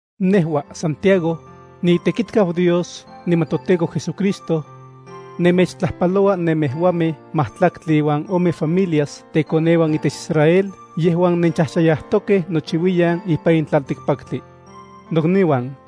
Nejua, Santiago, niitekitkau Dios niman toTEKO JesuCristo. Nemechtlajpaloua nemejuamej majtlaktli iuan ome familias tekoneuan itech Israel yejuan nenchajchayajtokej nochiuiyan ipan in tlaltikpaktli. Nokniuan,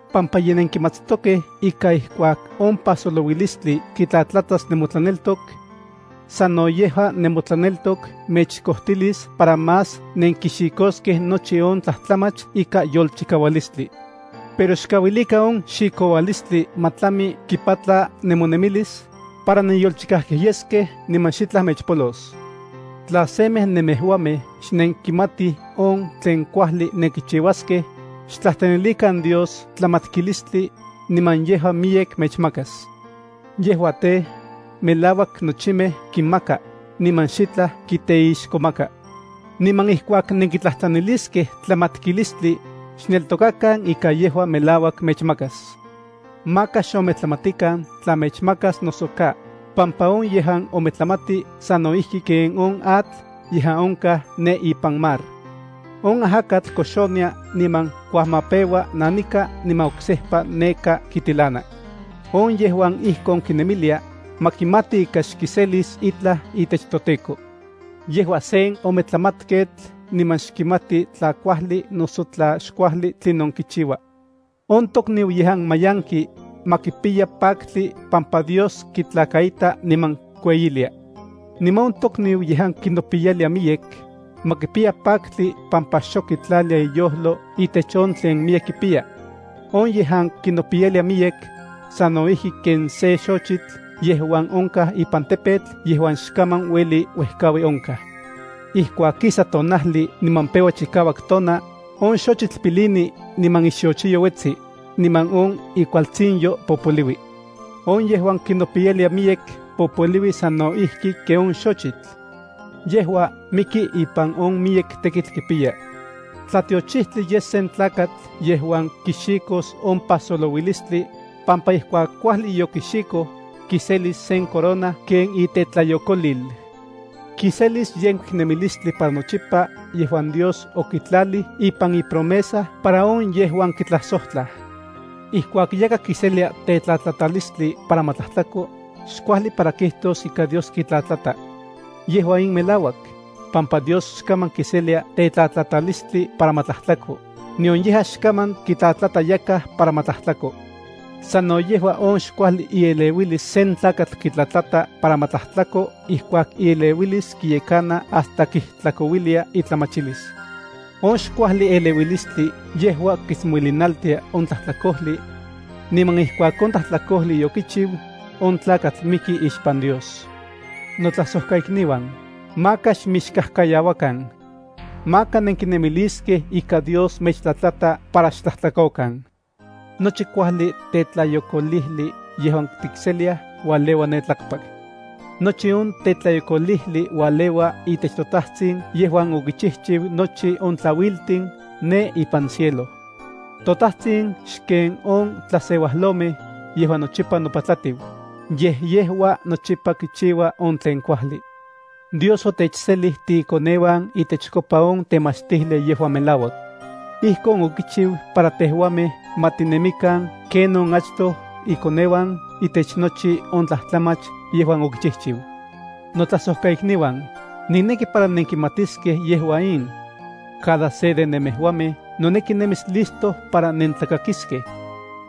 pampa ye nenkimatstokej ika ijkuak on pajsolouilistli kitlatlatas nemotlaneltok. Sano yejua nemotlaneltok mechkojtilis para más nenkixikoskej nochi on tlajtlamach ikan yolchikaualistli. Pero xkauilikan on xikoualistli ma tlami kipatla nemonemilis, para nenyolchikajkej yeskej niman xitlaj mechpolos. Tla semej nemejuamej xnenkimatij on tlen kuajli nenkichiuaskej, xtlajtlanilikan Dios tlamatkilistli, niman yejua miyek mechmakas. Yejua tej, melauak nochimej kinmaka, niman xitlaj kiteixkomaka. Niman ijkuak nenkitlajtlaniliskej tlamatkilistli, xneltokakan ika yejua melauak mechmakas. Maka xometlamatikan tla mechmakas noso ka, pampa on yejuan ometlamati sano ijki ken on atl yejuan onkaj ne ipan mar. On ajakatl koxonia niman kuajmapeua nanika niman oksejpa neka kitilana. On yejuan ijkon kinemilia, ma kimati ika xkiselis itlaj itech toTEKO. Yejua sen ometlamatketl niman xkimati tla kuajli noso tla xkuajli tlinon kichiua. On tokniu yejuan mayanki, ma kipiya paktli pampa Dios kitlakaita niman kueyilia. Niman on tokniu yejuan kinopiyalia miyek, ma kipiya paktli pampa xok kitlalia iyojlo itech on tlen miyek kipiya. On yejuan kinopiyalia miyek, sano ijki ken sen xochitl yejuan onkaj ipan tepetl yejuan xkaman ueli uejkaui onkaj. Ijkuak kisa tonajli niman peua chikauak tona, on xochitl pilini niman ixochiyo uetsi, niman on ikualtsinyo popoliui. On yejuan kinopiyalia miyek popoliui sano ijki ken on xochitl. Yejua miki ipan on miyek tekitl kipiya. Tlatiochijtli yes sen tlakatl yejuan kixikos on pajsolouilistli, pampa ijkuak kuajli yokixikoj, kiselis sen corona ken itetlayokolil. Kiselis yenkuik nemilistli para nochipa yejuan Dios okitlalij ipan ipromesa para on yejuan kitlajsojtlaj. Ijkuak yakaj kiselia tetlatlatalistli para ma tlajtlako, xkuajli para kijtos ika Dios kitlatlata. Yejua in melauak, pampa Dios xkaman kiselia tetlatlatalistli para ma tlajtlako, nion yejua xkaman kitlatlata yakaj para ma tlajtlako. Sano yejua on xkuajli ieleuilis sen tlakatl kitlatlata para ma tlajtlako ijkuak ieleuilis kiyekana hasta kijtlakouilia itlamachilis. On xkuajli eleuilistli yejua kitsmolinaltia on tlajtlakojli. Niman ijkuak on tlajtlakojli yokichiu, on tlakatl miki ixpan Dios. Notlajsojkaikniuan, maka xmixkajkayauakan. Maka nenkinemiliskej ika Dios mechtlatlata para xtlajtlakokan. Nochi kuajli tetlayokolijli yejuan tikseliaj ualeua ne tlakpak. Nochi on tetlayokolijli ualeua itech toTajtsin yejuan okichijchiu nochi on tlauiltin ne ipan cielo. ToTajtsin xken on tlaseuajlomej yejuan nochipa nopatlajtiu, yej yejua nochipa kichiua on tlen kuajli. Dios otechselij tiikoneuan itechkopa on temachtijli yejuan melauak. Ijkon okichiu para tejuamej ma tinemikan ken on achtoj ikoneuan itech nochi on tlajtlamach yejuan okichijchiu. Notlajsojkaikniuan, nikneki para nenkimatiskej yejua in: Cada se de nemejuamej noneki nemis listo para nentlakakiskej.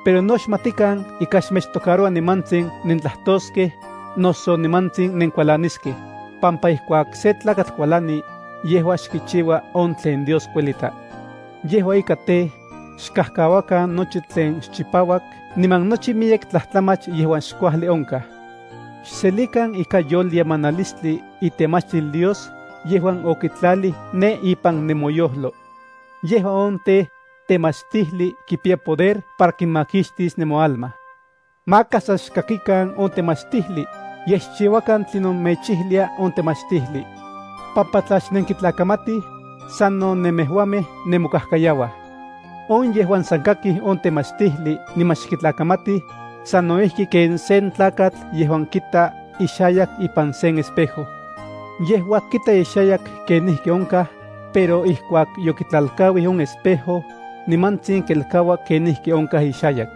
Pero no xmatikan ika xmechtocaroua nimantsin nentlajtoskej, noso nimantsin nenkualaniskej, pampa ijkuak sen tlakatl kualani, yejua xkichiua on tlen Dios kuelita. Yejua ika tej, xkajkauakan nochi tlen xchipauak niman nochi miyek tlajtlamach yejuan xkuajli onkaj. Xselikan ikan yolyemanilistli itemachtil Dios yejuan okitlalij ne ipan nemoyojlo. Yejua tej, temachtijli kipiya poder para kimakixtis nemoalma. Maka san xkakikan on temachtijli, yej xchiuakan tlinon mechijlia on temachtijli. Pampa tla xnenkitlakamatij, sano nemejuamej nemokajkayauaj. On yejuan san kaki on temachtijli niman xkitlakamati, sano ijki ken sen tlakatl yejuan kita ixayak ipan sen espejo. Yejua kita ixayak kenijki onkaj, pero ijkuak yokitlalkauij on espejo, nimantsin kelkaua kenijki onkaj ixayak.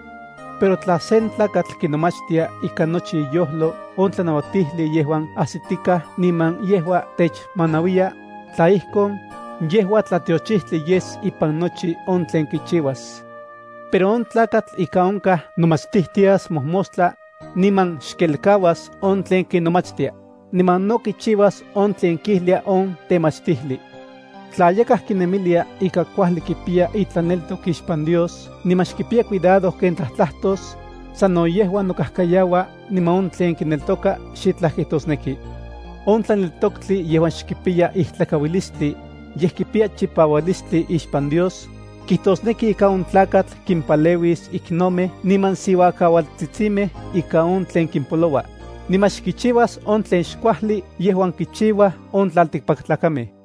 Pero tla sen tlakatl kinomachtia ikan nochi iyojlo on tlanauatijli yejuan ajsitikaj niman yejuan techmanauiya, tla ijkon, yejua tlatiochijtli yes ipan nochi on tlen kichiuas. Pero on tlakatl ika onkaj nomachtijtias mojmostla, niman xkelkauas on tlen kinomachtia, niman no kichiuas on tlen kijlia on temachtijli. Tla yakaj kinemilia ika kuajli kipiya itlaneltok ixpan Dios niman xkipiya cuidado ken tlajtlatos, sano yejua nokajkayaua niman on tlen kineltoka xitlaj kijtosneki. On tlaneltoktli yejuan xkipiya ijtlakauilistli, yej kipiya chipaualistli ixpan Dios, kijtosneki ika on tlakatl kimpaleuis iknomej niman siuakaualtsitsimej ika on tlen kimpoloua, niman xkichiuas on tlen xkuajli yejuan kichiuaj on tlaltikpaktlakamej.